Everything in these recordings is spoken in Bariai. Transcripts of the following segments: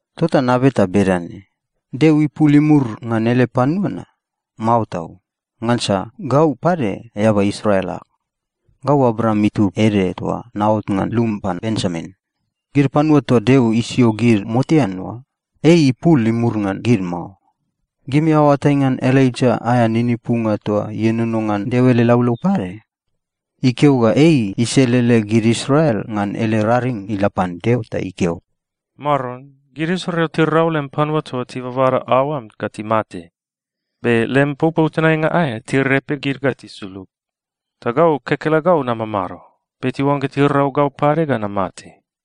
Tota nabeta bedane: Deo ipul imur ngan ele panua na? Mao tau! Ngansa gau pade eaba Israel ag. Gau Abraam itub ede toa naot ngan lum pan Benjamin. Gid panua toa Deo isio gid motean oa, ei ipul imur ngan gid mao. Gimi aoatai ngan Elaija aea ninipunga toa ienono ngan Deo ele laulau pade? Ikeo ga ei iselele gid Israel ngan ele raring ila pan Deo ta ikeo, “Maron, gid Israel tirau lem panua toa tibabada aoam ga timate! Be lem popou tenainga aea, tirepe gid ga tisulug. Ta gau kekelegau namamado. Be tiuangga tirau gau pade ga namate.”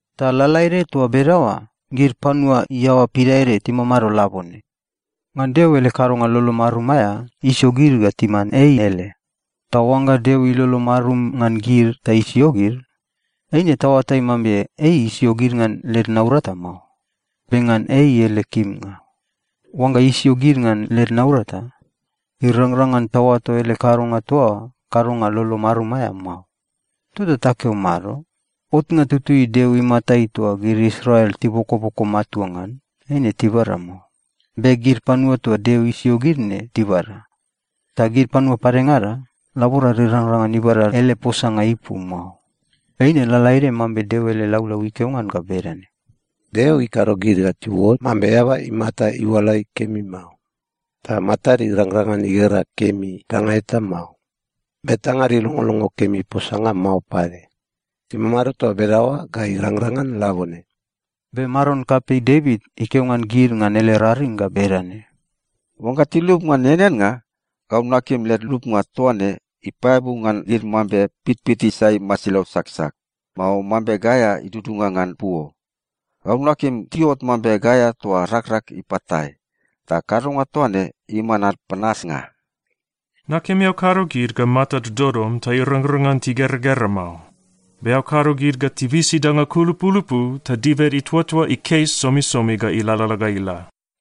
Ta lalaede toa bedaoa, gid panua iaoa pidaede timamado labone. Ngan Deo ele kadonga lolo marum aea, isio gid ga timan ei ele. Ta oangga Deo ilolo marum ngan gid ta isio gid, eine taoatai mambe ei isio gid ngan led naurata mao, be ngan ei ele kimnga. Oangga isio gid ngan led naurata, irangrang ngan taoato ele kadonga toa oa kadonga lolo marum aea mao. Tota takeo mado? Otnga tutui Deo imatai toa gid Israel tibokoboko matua ngan, eine tibada mao. Be gid panua toa Deo isio gid ne, tibada. Ta gid panua padengada, laborad irangrang ngan ibada ele posanga ipu mao. Eine lalaede mambe Deo ele laulau ikeo ngan ga bedane, “Deo ikado gid ga tiuot mambe eaba imata iualai kemi mao. Ta matad irangrang ngan igera kemi danga eta mao. Be tangad ilongolongo kemi posanga mao pade. Timamado toa bedaoa ga irangrang ngan labone.” Be maron kapei Devit ikeo ngan gid ngan ele raring ga bedane, “Oangga tilup ngan eaneannga, gau nakim led lupnga toa ne ipaeabu ngan gid mambe pitpit isai masilau saksak, mao mambe gaea idudunga ngan puo. Gau nakim tiuot mambe gaea toa rakrak ipatae, ta kadonga toa ne iman ad panasnga. Nakim eao kado gid ga matad dodom ta irangrang ngan tigeragera mao. Be eao kado gid ga tibisi danga kulupulupu ta dibed ituatua ikes somisomi ga ilalala ga ila.”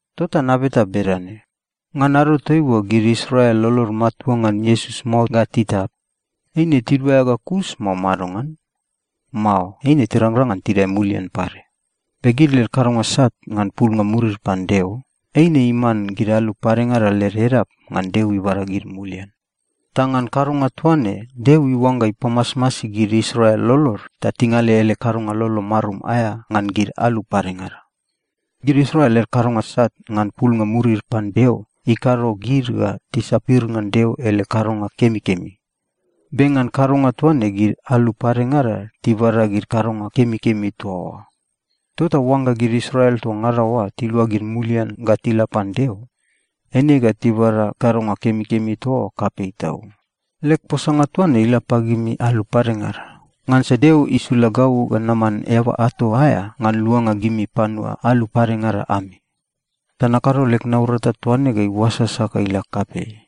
Tota nabeta bedane: Ngan ado toaiua gid Israel lolod matua ngan Iesus mao ga titap, eine tiduaea ga kus, mao madongan? Mao, eine tirangrang ngan tidae mulian pade. Be gid led kadonga sat ngan pulnga murid pan Deo, eine iman gid alu padengada led edap ngan Deo ibada gid mulian. Ta ngan kadonga toa ne, Deo iuangga ipamasmasi gid Israel lolod ta tingale ele kadonga lolo marum aea ngan gid alu padengada. Gid Israel led kadonga sat ngan pulnga murid pan Deo ikado gid ga tisapir ngan Deo ele kadonga kemikemi. Be ngan kadonga toa ne, gid alu padengada tibada gid kadonga kemikemi toa oa. Tota oangga gid Israel toa ngada oa tiluagid mulian ga tila pan Deo, eine ga tibada kadonga kemikemi toa oa kapei tau. Leg posanga toa ne ila pagimi alu padengada. Ngansa Deo isula gau ga naman eaba ato aea ngan luanga gimi panua alu padengada ami. Ta nakado leg naurata toa ne ga iuasasa ga ila kapei,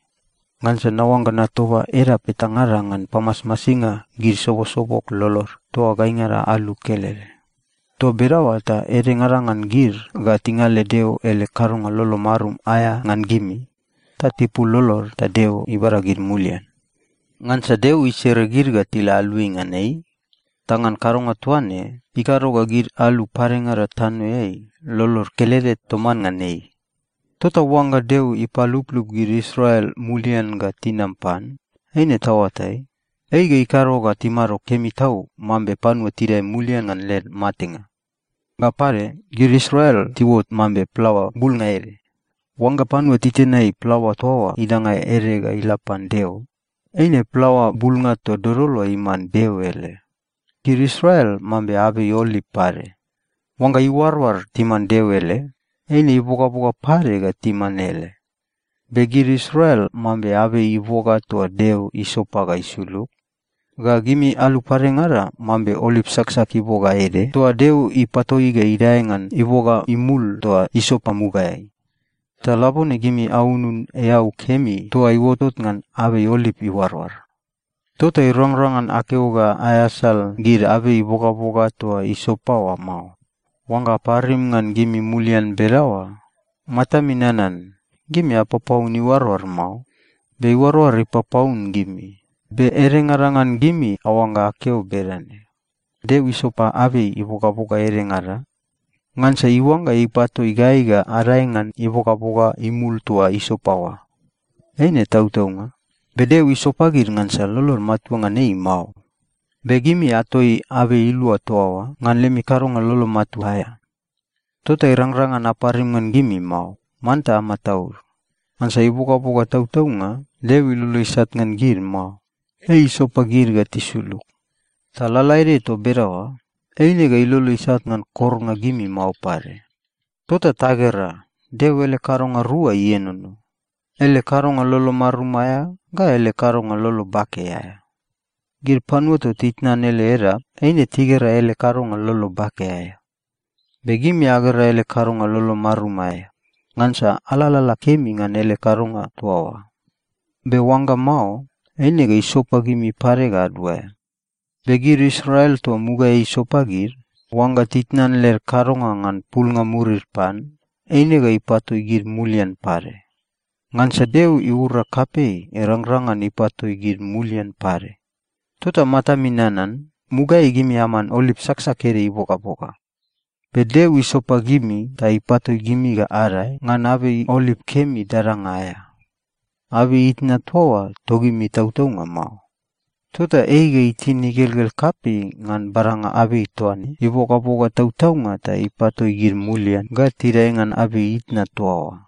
ngansa naoangga natoba edap etangada ngan pamasmasinga gid sobosobog lolod toa gaingada alu kelede. Toa bedaoa ta edengada ngan gid ga tingale Deo ele kadonga lolo marum aea ngan gimi, ta tipul lolod ta Deo ibada gid mulian. Ngansa Deo isere gid ga tila aluai ngan ei. Ta ngan kadonga toa ne, ikado ga gid alu padengada tanoeai lolod kelede toman ngan ei. Tota oangga Deo ipaluplup gid Israel mulian ga tinam pan, eine taoatai, ei ga ikado ga timado kemi tau mambe panua tidae mulian ngan led matenga. Ga pade, gid Israel tiuot mambe plaoa bulnga ede. Oangga panua titenai plaoa toa oa idanga ede ga ila pan Deo, eine plaoa bulnga toa dodol oa iman Deo ele. Gid Israel mambe abei oliv pade. Oangga iuaroar timan Deo ele, eine ibogaboga pade ga timan ele. Be gid Israel mambe abei iboga toa Deo isopa ga isulug. Ga gimi alu padengada mambe oliv saksak iboga ede toa Deo ipatoi ga idae ngan iboga imul toa isopa mugaeai. Ta labone gimi aunun eau kemi toa iuotot ngan abei oliv iuaroar. Tota irangrang ngan akeo ga aeasal gid abei ibogaboga toa isopa oa mao. Oangga aparim ngan gimi mulian bedaoa, matami nanan, gimi apapaun iuaroar mao, be iuaroar ipapaun gimi. Be edengada ngan gimi aoangga akeo bedane, “Deo isopa abei ibogaboga edengada ngansa iuangga ipatoi gai ga adae ngan ibogaboga imul toa isopa oa.” Eine tautaunga. Be Deo isopa gid ngansa lolod matua ngan ei mao. Be gimi atoi abei ilua toa oa ngan lemi kadonga lolo matua aea. Tota irangrang ngan aparim ngan gimi mao. Manta amataud. Ngansa ibogaboga tautaunga, Deo ilolo isat ngan gid mao. Ei isopa gid ga tisulug. Ta lalaede toa bedaoa, eine ga ilolo isat ngan kornga gimi mao pade. Tota tagera, Deo ele kadonga rua ienono, ele kadonga lolo marum aea ga ele kadonga lolo bake aea. Gid panua toa titnan ele edap, eine tigera ele kadonga lolo bake aea. Be gimi agera ele kadonga lolo marum aea, ngansa alalala kemi ngan ele kadonga toa oa. Be oangga mao, eine ga isopa gimi pade ga aduaea. Be gid Israel toa mugaeai isopa gid, oangga titnan led kadonga ngan pulnga murid pan, eine ga ipatoi gid mulian pade. Ngansa Deo iura kapei irangrang ngan ipatoi gid mulian pade. Tota matami nanan, mugaeai gimi aman oliv saksak ede ibogaboga. Be Deo isopa gimi ta ipatoi gimi ga adae ngan abei oliv kemi dadanga aea. Abei itna toa oa togimi tautaunga mao. Tota ei ga itin igelgel kapei ngan badanga abei toa ne ibogaboga tautaunga ta ipatoi gid mulian ga tidae ngan abei itna toa oa.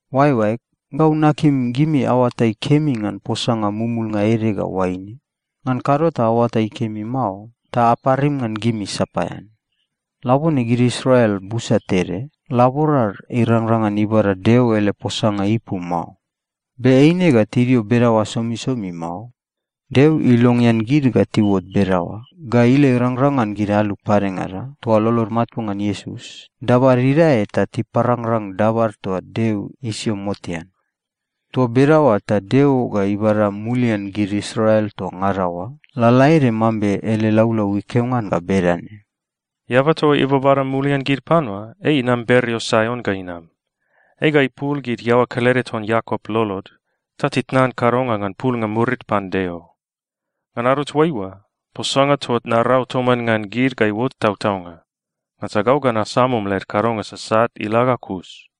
Oaeoaeg, gau nakim gimi aoatai kemi ngan posanga mumulnga ede ga oaine. Ngan kado ta aoatai kemi mao, ta aparim ngan gimi sapaean. Labone gid Israel busa tede, laborad irangrang ngan ibada Deo ele posanga ipu mao. Be eine ga tidio bedaoa somisomi mao. Deo ilongean gid ga tiuot bedaoa ga ila irangrang ngan gid alu padengada toa lolod matua ngan Iesus, dabad idae ta tiparangrang dabad toa Deo isio motean. Toa bedaoa ta Deo ga ibada mulian gid Israel toa ngada oa, lalaede mambe ele laulau ikeo ngan ga bedane, “Eaba toa ibabada mulian gid panua, ei inam bereo Saion ga inam. Ei ga ipul gid iaoa kelede ton Iakop lolod ta titnan kadonga ngan pulnga murid pan Deo. Ngan ado toaiua, posanga toa narau toman ngan gid ga iuot tautaunga. Ngansa gau ga nasumum led kadonga sasat ila ga kus.”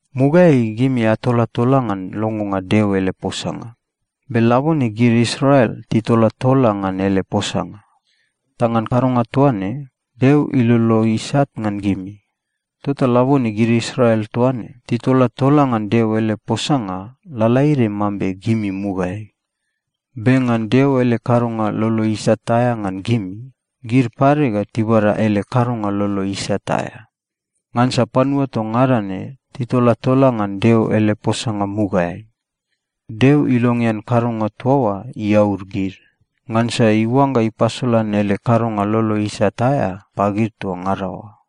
Mugaeai gimi atolatola ngan longonga Deo ele posanga. Be labone gid Israel titolatola ngan ele posanga. Ta ngan kadonga toa ne, Deo ilolo isat ngan gimi. Tota labone gid Israel toa ne titolatola ngan Deo ele posanga lalaede mambe gimi mugaeai. Be ngan Deo ele kadonga lolo isat aea ngan gimi, gid pade ga tibada ele kadonga lolo isat aea. Ngansa panua toa ngada ne titolatola ngan Deo ele posanga mugaeai. Deo ilongean kadonga toa oa iaud gid, ngansa iuangga ipasolan ele kadonga lolo isat aea pagid toa ngada oa.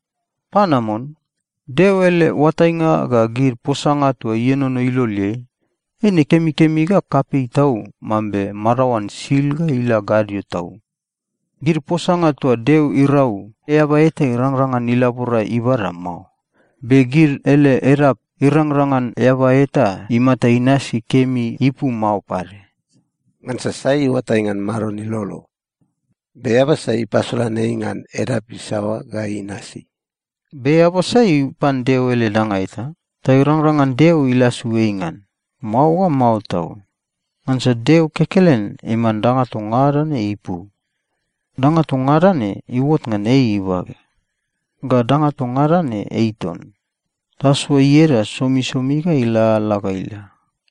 Panamon! Deo ele oatainga ga gid posanga toa ienono iloleai, eine kemikemi ga kapei tau mambe madaoan sil ga ila gadio tau. Gid posanga toa Deo irau, eaba eta irangrang ngan ilabora ibada mao. Be gid ele edap, irangrang ngan eaba eta imata inasi kemi ipu mao pade. “Ngansa sai iuatai ngan Maron ilolo? Be eaba sai ipasolan ei ngan edap isaoa ga inasi?” “Be eaba sai ipan Deo ele danga eta ta irangrang ngan Deo ilasu ei ngan? Mao ga mao tau!” Ngansa Deo kekelen iman danga toa ngada ne ipu. Danga toa ngada ne iuot ngan ei ibage. Ga danga toa ngada ne ei ton. Tasoa ieda somisomi ga ilalala ga ila!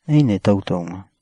Eine tautaunga.